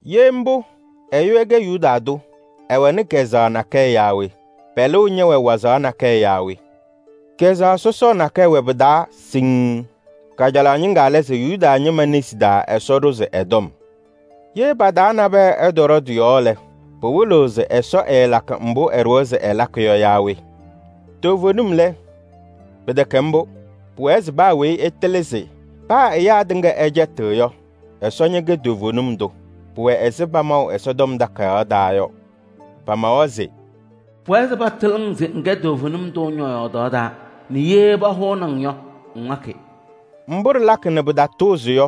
Ye mbʋ, ɛyʋ ɛkɛ Yuda tʋ, ɛwɛnɩ kazʋwa nakɛyɛ yaa we? Pɛlʋʋ ñɛwɛ wazaɣ nakɛyɛ yaa we? Kazʋwa wɛ pɩtɩŋa pɩ-taa siŋŋ. Kajalaɣ ñɩŋga lɛ se Yuda ñɩma nesi taa Ɛsɔ ɖʋzɩ ɛ-tɔm. Ye pa-taa nabɛyɛ ɛtɔɖɔ tɩ-yɔɔ lɛ, pɩwɩlɩɣ se Ɛsɔ ɛɛlakɩ mbʋ ɛɖʋwa se ɛlakɩ yɔ yaa we? Toovenim lɛ, pɩtɛkɛ mbʋ! Pʋwɛɛ se paa weyi ɛtɩlɩ se paa ɛyaa tɩŋa ɛcɛtɩɣ yɔ, Ɛsɔ ñɛkɛ toovenim tʋ. Pʋwɛ ɛzɩ pamaʋ yɔ, pamawa se: “Pʋwɛɛ se patɩlɩ-ŋ se ŋkɛ toovenim tʋ ñɔ-yɔɔdaɣ taa nɛ ŋwa alɩwaatʋ ndʋ pahʋʋnɩ-ŋ yɔ.” Mbʋ ɖɩlakɩ nɛ pɩtatʋʋzɩ yɔ,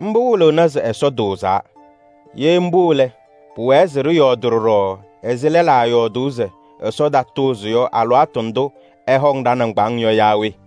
mbʋ wɩlɩɣnɩ se Ɛsɔ tʋʋzaa. Ye mbʋ lɛ, pʋwɛɛ se ɖɩyɔɔdɩ ɖɔɖɔ ɛzɩ lɛlaa yɔɔdʋʋ se Ɛsɔ tatʋʋzɩ yɔ alɩwaatʋ ndʋ ɛhɔŋ ɖa-nɩŋgbaaŋ yɔ yaa we?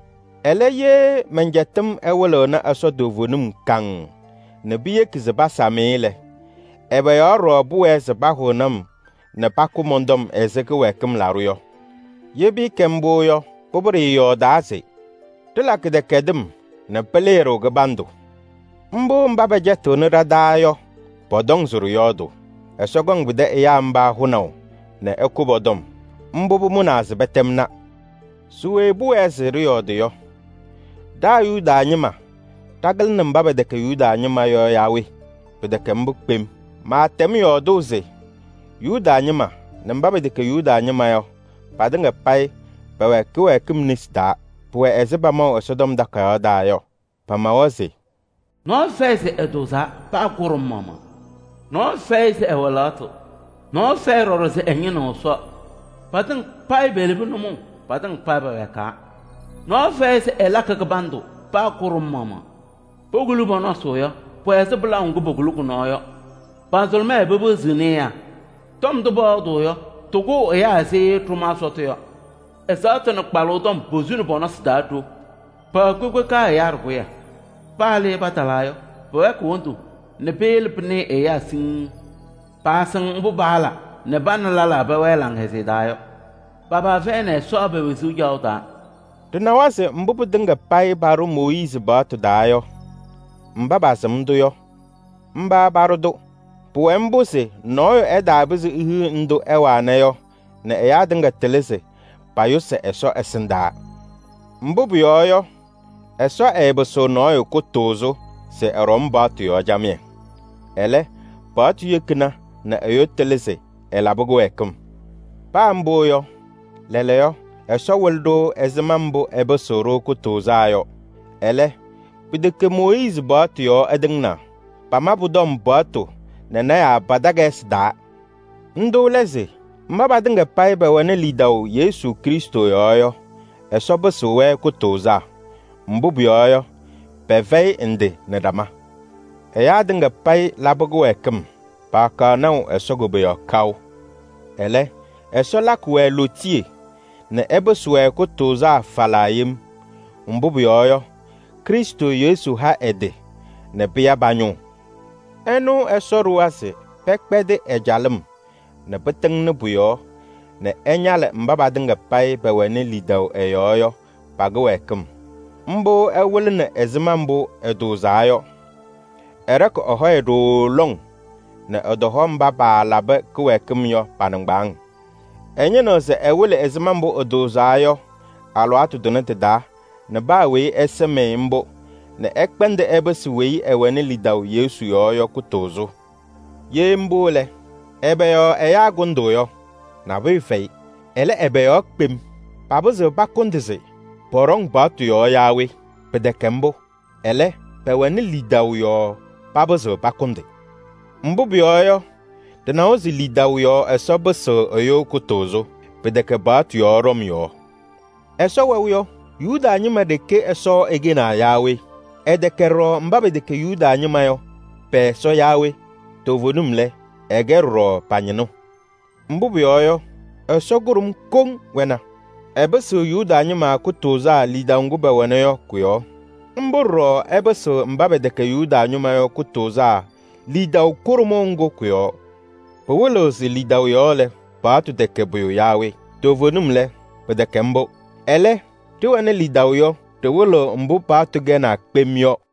Ɛlɛ, ye mɛn-cɛtɩm ɛwɩlɩɣnɩ Ɛsɔ toovenim kaŋŋ nɛ piyeki se pasam-ɩ lɛ, ɛbɛ yɔɔ ɖɔɖɔ pʋwɛɛ se pahʋnɩ-m nɛ pakʋ mɔn-tɔm ɛzɩ kɩwɛɛkɩm laɖʋ yɔ? Ye pɩɩkɛ mbʋ yɔ, pʋbʋ ɖɩɩyɔɔdaa se: “Ɖɩla kɩdɛkɛdɩm nɛ pɩlɩɩ-ɖʋ kɩbandʋ.” Mbʋ mba pɛcɛtɩɣnɩ ɖa-taa yɔ pɔtɔŋ se ɖɩyɔɔdʋʋ. Ɛsɔ kɔŋ pɩtɛ ɛyaa mba hʋnaʋ nɛ ɛkʋ pɔ-tɔm, mbʋ pʋmʋnaa se pɛtɛmna. Se we pʋwɛɛ se ɖɩyɔɔdɩ yɔ? Ɖa Yuda ñɩma ɖakɩlɩnɩ mba pɛtɛkɛ Yuda ñɩma yɔ yaa we? Pɩtɛkɛ mbʋ kpem! Maatɛm yɔɔdʋʋ se Yuda ñɩma nɛ mba pɛtɛkɛ Yuda ñɩma yɔ, patɩŋa payɩ pɛwɛ kɩwɛɛkɩm nesi taa. Pʋwɛ ɛzɩ pamaʋ yɔ. Pamawa se: “Nɔɔyʋ fɛyɩ se ɛtʋʋzaa, paa kʋɖʋm maɣmaɣ. Nɔɔyʋ fɛyɩ se ɛwɛ lɛɣtʋ. Nɔɔyʋ fɛyɩ ɖɔɖɔ se ɛñɩnɩɣ Ɛsɔ. Patɩŋa payɩ pelebi nʋmɔʋ, patɩŋa payɩ pɛwɛɛkaa. Nɔɔyʋ fɛyɩ se ɛlakɩ kɩbandʋ, paa kʋɖʋm maɣmaɣ. Pokuli pɔ-nɔsɩ yɔ, pʋwɛ ɛzɩ pɩlaʋ ŋgʋ pokuli kʋ-nɔɔ yɔ. Pa-nzʋlʋmɛɛ pepeɣziɣni ɛyaa nɛ tɔm ndʋ pɔyɔɔdʋʋ yɔ tɩkʋʋ ɛyaa ɛzɩ ɖʋmaa sɔtʋ yɔ. Ɛzaɣtʋ nɛ mbusu tɔm posuni pɔ-nɔsɩ taa ɖo. Pɛwɛ kpekpeka ɛyaa ɖɩkʋyɛ. Paa le patalaa yɔ, pɛwɛɛkɩɣ wondu nɛ peyele pɩnɩɩ ɛyaa siŋŋ. Paasɩŋ mbʋ paala nɛ pa nɛ lɛlaa pɛwɛɛ laŋhɛzɩyɛ taa yɔ. Pa-paa fɛyɩnɩ Ɛsɔ pe-wezuu caɣʋ taa.” Ɖɩnawa se mbʋ pɩtɩŋa payɩ paɖʋ Mooyiizi paɣtʋ taa yɔ, mba pasɩm-tʋ yɔ, mba paɖʋ-tʋ. Pʋwɛ mbʋ se nɔɔyʋ ɛtaapɩzɩ ehiɣ ndʋ ɛwana yɔ nɛ ɛyaa tɩŋa tɩlɩ se payʋsɩ Ɛsɔ ɛsɩndaa. Mbʋ pʋyɔɔ yɔ, Ɛsɔ ɛɛpɩsɩɣ nɔɔyʋ kʋtʋʋzʋ se ɛɖɔm paɣtʋ yɔɔ camɩyɛ. Ɛlɛ, paɣtʋ yekina nɛ ɛyʋ tɩlɩ se ɛlabɩ kɩwɛɛkɩm. Paa mbʋ yɔ, lɛɛlɛɛyɔ Ɛsɔ wɩlɩ-ɖʋ ɛzɩma mbʋ ɛpɩsɩɣ-ɖʋ kʋtʋʋzaa yɔ. Ɛlɛ, pɩtɛkɛ Mooyiizi paɣtʋ yɔɔ ɛtɩŋnaa. Pama pʋ-tɔm paɣtʋ nɛ lɔɔyɩsɩ tɩnaa pa-takayɩsɩ taa. Ndʋ lɛ se: mba patɩŋa payɩ pɛwɛnɩ lidaʋ Yesu Krɩstʋ yɔɔ yɔ, Ɛsɔ pɩsɩɣ-wɛ kʋtʋʋzaa. Mbʋ pʋyɔɔ yɔ, pɛfɛyɩ ndɩ nɛ ɖama: ɛyaa tɩŋa payɩ labɩ kɩwɛɛkɩm, paakaɣ naʋ Ɛsɔ koboyaɣ kaʋ. Ɛlɛ, Ɛsɔ lakɩ-wɛ lootiye nɛ ɛpɩsɩ-wɛ kʋtʋʋzaa falaa yem. Mbʋ pʋyɔɔ yɔ, Krɩstʋ Yesu ha ɛ-tɩ nɛ pɩya pa-ñʋʋ. Ɛnʋ Ɛsɔ ɖʋwa se pɛkpɛdɩ ɛ-calɩm nɛ pɩtɩŋnɩ pʋ-yɔɔ nɛ ɛñalɩ mba patɩŋa payɩ pɛwɛnɩ lidaʋ ɛ-yɔɔ yɔ, pa-kɩwɛɛkɩm. Mbʋ ɛwɩlɩnɩ ɛzɩma mbʋ ɛtʋʋzaa yɔ. Ɛɖɔkɩ ɛ-hɔyɛ ɖooo lɔŋ nɛ ɛtɔhɔ mba paalabɩ kɩwɛɛkɩm yɔ pa-nɩŋgbaaŋ. Ɛñɩnɩɣ se ɛwɩlɩ ɛzɩma mbʋ ɛtʋʋzaa yɔ alɩwaatʋ tʋnɛ tɩ-taa nɛ paa weyi ɛsɩm-ɩ mbʋ nɛ ɛkpɛndɩ ɛpɩsɩ weyi ɛwɛnɩ lidaʋ Yesu yɔɔ yɔ kʋtʋʋzʋ. Ye mbʋ lɛ, ɛbɛ yɔɔ ɛyaa kʋndʋʋ yɔ? Nabʋyʋ fɛyɩ. Ɛlɛ, ɛbɛ yɔɔ kpem? Papɩzɩɣ pakʋndɩ se pɔɖɔŋ paɣtʋ yɔɔ yaa we? Pɩtɛkɛ mbʋ! Ɛlɛ, pɛwɛnɩ lidaʋ yɔɔ papɩzɩɣ pakʋndɩ. Mbʋ pʋyɔɔ yɔ, ɖɩnawa se lidaʋ yɔɔ Ɛsɔ pɩsɩɣ ɛyʋ kʋtʋʋzʋ. Pɩtɛkɛ paɣtʋ yɔɔ ɖɔm yɔɔ. Ɛsɔ wɛʋ yɔ, Yuda ñɩma ɖeke Ɛsɔ ɛkɛnaa yaa we? Ɛtɛkɛ ɖɔɖɔ mba pɛtɛkɛ Yuda ñɩma yɔ pɛ-Ɛsɔ yaa we? Toovenim lɛ, ɛkɛ ɖɔɖɔ pa-ñɩnʋ. Mbʋ pʋyɔɔ yɔ, Ɛsɔ kʋɖʋm koŋ wɛna. Ɛpɩsɩɣ Yuda ñɩma kʋtʋʋzaa lidaʋ ŋgʋ pɛwɛna yɔ kʋ-yɔɔ. Mbʋ ɖɔɖɔ ɛpɩsɩɣ mba pɛtɛkɛ Yuda ñɩma yɔ kʋtʋʋzaa lidaʋ kʋɖʋmʋʋ ŋgʋ kʋ-yɔɔ. Pɩwɩlɩɣ se lidaʋ yɔɔ lɛ, paɣtʋ tɛkɛ pʋyʋ yaa we? Toovenim lɛ, pɩtɛkɛ mbʋ! Ɛlɛ, ɖɩwɩlɩɣ mbʋ paɣtʋ kɛnaa kpem yɔ.